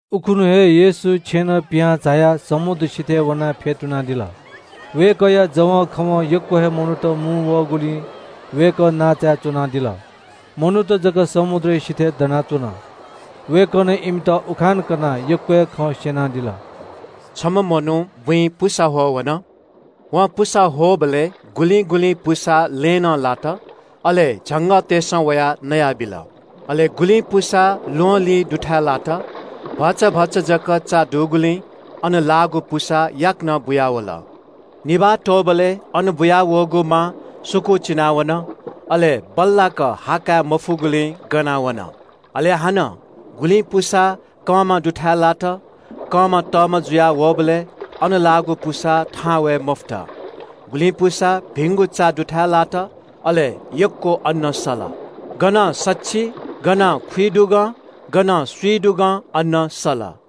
उखुन्‍हु हे येशू छेँनं पिहां झायाः समुद्र सिथय् वनाः फ्‍यतुनादिल। वय्‌कःया जवंखवं यक्‍व हे मनूत मुंवःगुलिं वय्‌कः नांचाय् च्‍वनादिल। मनूत जक समुद्रया सिथय् दनाच्‍वन। वय्‌कलं इमित उखान कनाः यक्‍व हे खँ स्‍यनादिल। “छम्‍ह मनू बुँइ पुसा ह्वः वन। वं पुसा ह्वःबलय् गुलिं गुलिं पुसा लँय् नं लात, अले झंगःतय्‌सं वयाः नयाबिल। अले गुलिं पुसा ल्‍वहंलिं दुथाय् लात। भचा भचा जक चा दुगुलिं अन लाःगु पुसा याकनं बुयावल। निभाः त्‍वःबलय् अन बुयावःगु मा सुकूचिना वन, अले बल्‍लाक हा काये मफुगुलिं गना वन। अले हानं गुलिं पुसा कंमा दुथाय् लात। कंमा तःमा जुया वःबलय् अन लाःगु पुसा थहां वये मफुत। गुलिं पुसा भिंगु चा दुथाय् लात, अले यक्‍व अन्‍न सल। गनं सछि, गनं खुइदुगं, गनं स्‍विदुगं अन्‍न सल।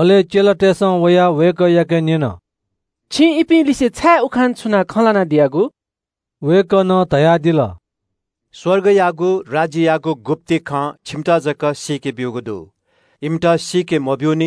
अले चेलातय्‌सं वयाः वय्‌कःयाके न्‍यन – “छिं इपिं लिसे छाय् उखान छुनाः खँ ल्‍हानादियागु?” वय्‌कलं धयादिल – “स्‍वर्गयागु राज्‍ययागु गुप्‍ति खँ छिमित जक सीके ब्‍यूगु दु। इमित सीके मब्‍यू।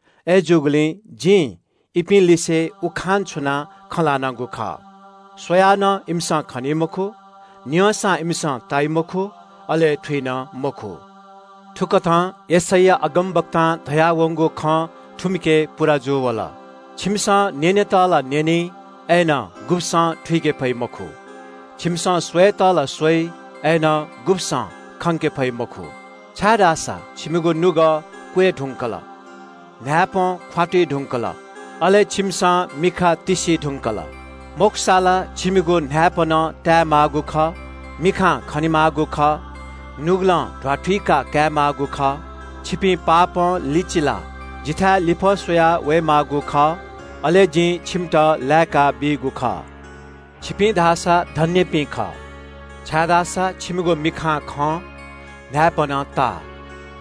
अय्‌जूगुलिं जिं इपिं लिसे उखान छुनाः खँ ल्‍हानागु खः – “‘स्‍वयाः नं इमिसं खनी मखु, न्‍यंसां इमिसं ताइ मखु, अले थुइ नं मखु।’ “थुकथं यशैया अगमवक्तां धयावंगु खँ थुमिके पूवन – “‘छिमिसं न्‍यनेत ला न्‍यनी, अय्‌नं गुब्‍सं थुइके फइ मखु। छिमिसं स्‍वयेत ला स्‍वइ, अय्‌नं गुब्‍सं खंके फइ मखु। छाय्‌धाःसा छिमिगु नुगः क्‍वय् धुंकल, न्‍हाय्‌पं ख्‍वातुइ धुंकल, अले छिमिसं मिखा तिस्‍सी धुंकल। मखुसा ला छिमिगु न्‍हाय्‌पनं ताये माःगु खः, मिखां खने माःगु खः, नुगलं ध्‍वाथुइका काये माःगु खः। छिपिं पापं लिचिलाः जिथाय् लिफः स्‍वया वये माःगु खः, अले जिं छिमित लाय्‌काबीगु खः।’ “छिपिं धाःसा धन्‍यपिं खः, छाय्‌धाःसा छिमिगु मिखां खं, न्‍हाय्‌पनं ता।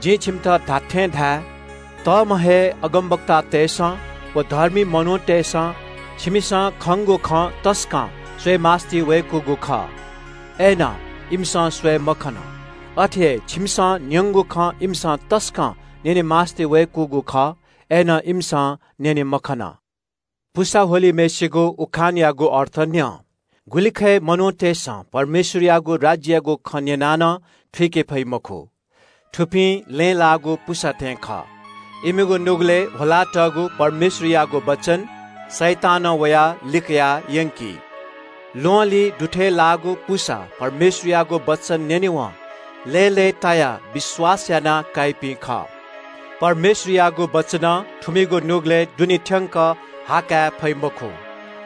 जिं छिमित धात्‍थें धाये – तःम्‍ह हे अगमवक्तातय्‌सं व धर्मी मनूतय्‌सं छिमिसं खंगु खँ तसकं स्‍वये मास्‍तिवय्‌कूगु खः, अय्‌नं इमिसं स्‍वये मखन। अथे हे छिमिसं न्‍यंगु खँ इमिसं तसकं न्‍यने मास्‍तिवय्‌कूगु खः, अय्‌नं इमिसं न्‍यने मखन। “पुसा ह्वलिम्‍हय्‌सिगु उखानयागु अर्थ न्‍यँ। गुलिखय् मनूतय्‌सं परमेश्‍वरयागु राज्‍ययागु खँ न्‍यनाः नं थुइके फइ मखु। थुपिं लँय् लाःगु पुसा थें खः। इमिगु नुगलय् ह्वलातःगु परमेश्‍वरयागु वचन शैतानं वयाः लिकया यंकी। ल्‍वहंलिं दुथाय् लाःगु पुसा परमेश्‍वरयागु वचन न्‍यनेवं लय्‌लय्‌तायाः विश्‍वास याना काइपिं खः। परमेश्‍वरयागु वचनं थुमिगु नुगलय् दुने थ्‍यंक हा काये फइ मखु।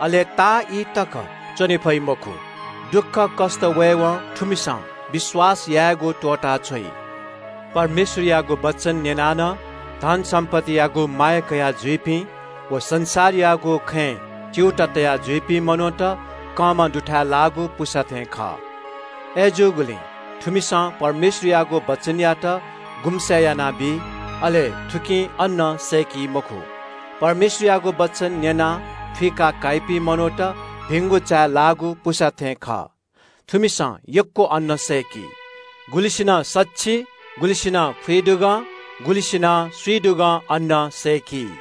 अले ताःईतक च्‍वने फइ मखु। दुःखकष्‍ट वयेवं थुमिसं विश्‍वास यायेगु त्‍वःताछ्वइ। परमेश्‍वरयागु वचन न्‍यनाः नं धन सम्‍पत्तियागु माया कयाजुइपिं व संसारयागु खँय् च्‍यूताः तया जुइपिं मनूत कंमा दुथाय् लाःगु पुसा थें खः। थुमिसं परमेश्‍वरयागु वचनयात गुम्‍से यानाबी। अले थुकिं अन्‍न सय्‌की मखु। परमेश्‍वरयागु वचन न्‍यनाः थुइका काइपिं मनूत भिंगु चाय् लाःगु पुसा थें खः। थुमिसं यक्‍व अन्‍न सय्‌की। गुलिसिनं सछि, गुलिसिनं खुइदुगं, गुलिसिनं स्‍विदुगं अन्‍न सय्‌की।”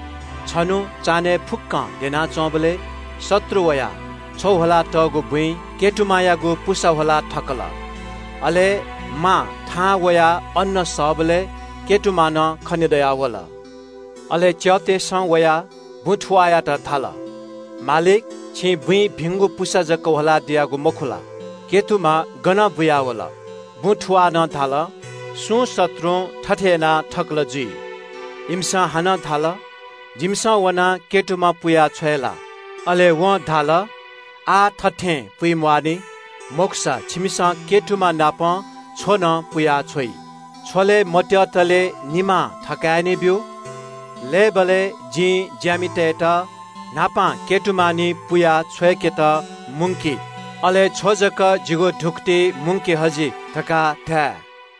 छन्‍हु चान्‍हय् फुक्‍कं द्यनाच्‍वंबलय् शत्रु वयाः छ्व ह्वलातःगु बुँइ नामायागु पुसा ह्वला थकल। अले मा थहां वयाः अन्‍न सःबलय् नामा नं खनेदयावल। “अले च्‍यःतय्‌सं वयाः बुँ थुवाःयात धाल – ‘मालिक, छिं बुँइ भिंगु पुसा जक ह्वला दियागु मखु ला? नामा गनं बुयावल?’ “बुँ थुवालं धाल – ‘सुं शत्रुं थथे यानाथकल जुइ।’ इमिसं हानं धाल – ‘जिमिसं वनाः नामा पुया छ्वये ला?’ “अले वं धाल – ‘आः थथें पुइ म्‍वाःनि। मखुसा छिमिसं नामा नाप छ्व नं पुया छ्वइ। छ्व लये मत्‍यःतले निमां थकाय् नि ब्‍यु। लय्‌बलय् जिं ज्‍यामितय्‌त न्‍हापां नामा निं पुयाः छ्वय्‌केत मुंकि, अले छ्व जक जिगु धुकुतिइ मुंके हजि धकाः धाये।’”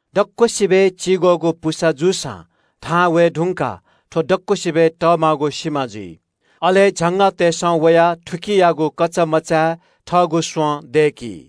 दक्‍वसिबय् चिग्‍वःगु पुसा जूसां थहां वये धुंकाः थ्‍व अन दुगु मेमेगु स्‍वयाः तःमा जुयाः सिमा जुल। अले झंगःतय्‌सं वयाः थुकियागु कचामचाय् थःगु स्‍वँ दय्‌की।”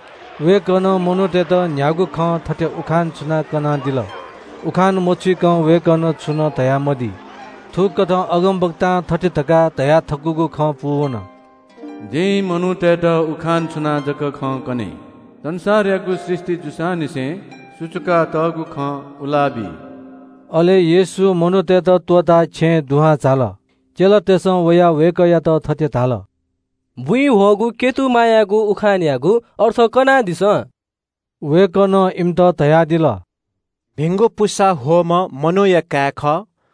वय्‌कलं मनूतय्‌त न्‍ह्यागु खं थथे उखान छुनाः कनादिल। उखान मछुइकं वय्‌कलं छुं नं स्‍यनामदी। थुकथं अगमवक्तां थथे धकाः धयाथकूगु खँ पूवन – “जिं मनूतय्‌त उखान छुनाः जक खँ कने। संसारयागु सृष्‍टि जूसांनिसें सुचुकातःगु खँ उला बी।” अले येशू मनूतय्‌त त्‍वःताः छेँय् दुहां झाल। चेलातय्‌सं वयाः वय्‌कःयात थथे धाल – “बुँइ ह्वःगु नामायागु उखानयागु अर्थ कनादिसँ।” वय्‌कलं इमित धयादिल – “भिंगु पुसा ह्वःम्‍ह मनूया काय् खः।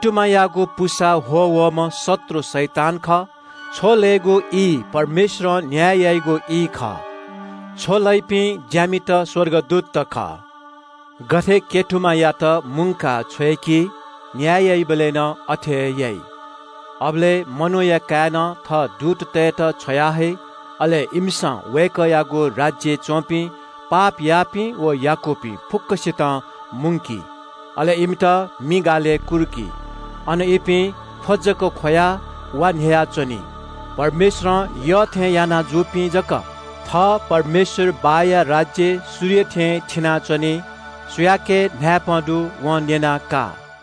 नामायागु पुसा ह्वः वःम्‍ह शत्रु शैतान खः। छ्व लयेगु ई परमेश्‍वरं न्‍याय याइगु ई खः। छ्व लइपिं ज्‍यामित स्‍वर्गदूतत खः। “गथे नामायात मुंकाः छ्वय्‌की न्‍याय याइबलय् नं अथे हे याइ। अबलय् मनूया काय्‌नं थः दूततय्‌त छ्वयाहइ। अले इमिसं वय्‌कःयागु राज्‍यय् च्‍वंपिं पाप याःपिं व याकूपिं फुक्‍कसितं मुंकी। अले इमित मि गालय् कुर्की। अन इपिं ख्‍व जक ख्‍वयाः वा न्‍ह्ययाच्‍वनी। परमेश्‍वरं यःथें यानाजुइपिं जक थः परमेश्‍वर बाःया राज्‍यय् सूर्य थें थिनाच्‍वनी। सुयाके न्‍हाय्‌पं दु वं न्‍यनाः का।”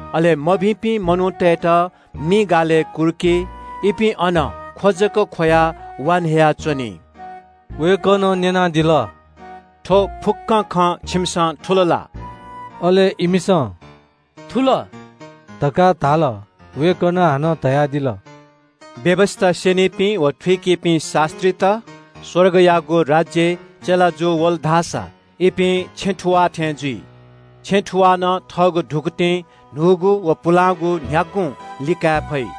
अले मभिंपिं मनूतय्‌त मि गालय् कुर्की। इपिं अन ख्‍व जक ख्‍वयाः वा न्‍ह्ययाच्‍वनी।” वय्‌कलं न्‍यनादिल – “थ्‍व खँ छिमिसं थुल ला?” अले इमिसं “थुल” धकाः धाल। वय्‌कलं हानं धयादिल – “व्‍यवस्‍था स्‍यनीपिं व थुइकीपिं शास्‍त्रीत स्‍वर्गयागु राज्‍यय् चेला जूवल धाःसा इपिं छेँ थुवाः थें जुइ। छेँ थुवालं थःगु धुकुतिं न्‍हूगु व पुलांगु न्‍ह्यागुं लिकाये फइ।”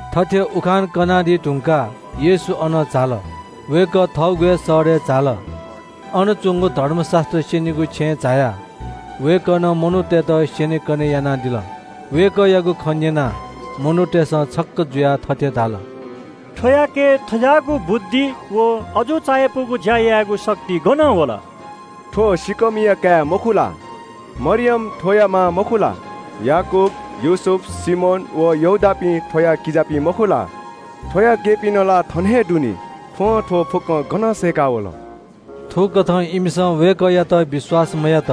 थथे उखान कनादी धुंकाः येशू अनं झाल। वय्‌कः थःगु हे शहरय् झाल। अन च्‍वंगु धर्मशास्‍त्र स्‍यनीगु छेँय् झायाः वय्‌कलं मनूतय्‌त स्‍यनेकने यानादिल। वय्‌कःयागु खँ न्‍यनाः मनूतय्‌सं छक्‍क जुयाः थथे धाल – “थ्‍वयाके थज्‍याःगु बुद्धि व अजू चायापुगु ज्‍या यायेगु शक्ति गनं वल? थ्‍व सिँकःमिया काय् मखु ला? मरियम थ्‍वया मां मखु ला? याकूब, योसेफ, सिमोन व यहूदापिं थ्‍वया किजापिं मखु ला? थ्‍वया केहेँपिं ला थन हे दु नि? थ्‍वं थ्‍व फुक्‍कं गनं सय्‌काः वल?” थुकथं इमिसं वय्‌कःयात विश्‍वास मयात।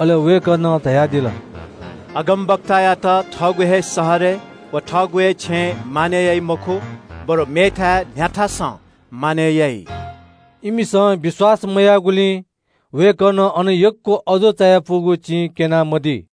अले वय्‌कलं धयादिल – “अगमवक्तायात थःगु हे शहरय् व थःगु हे छेँय् मानय् याइ मखु, बरु मेथाय् न्‍ह्याथासं मानय् याइ।” इमिसं विश्‍वास मयाःगुलिं वय्‌कलं अन यक्‍व अजू चायापुगु चिं क्‍यना मदी।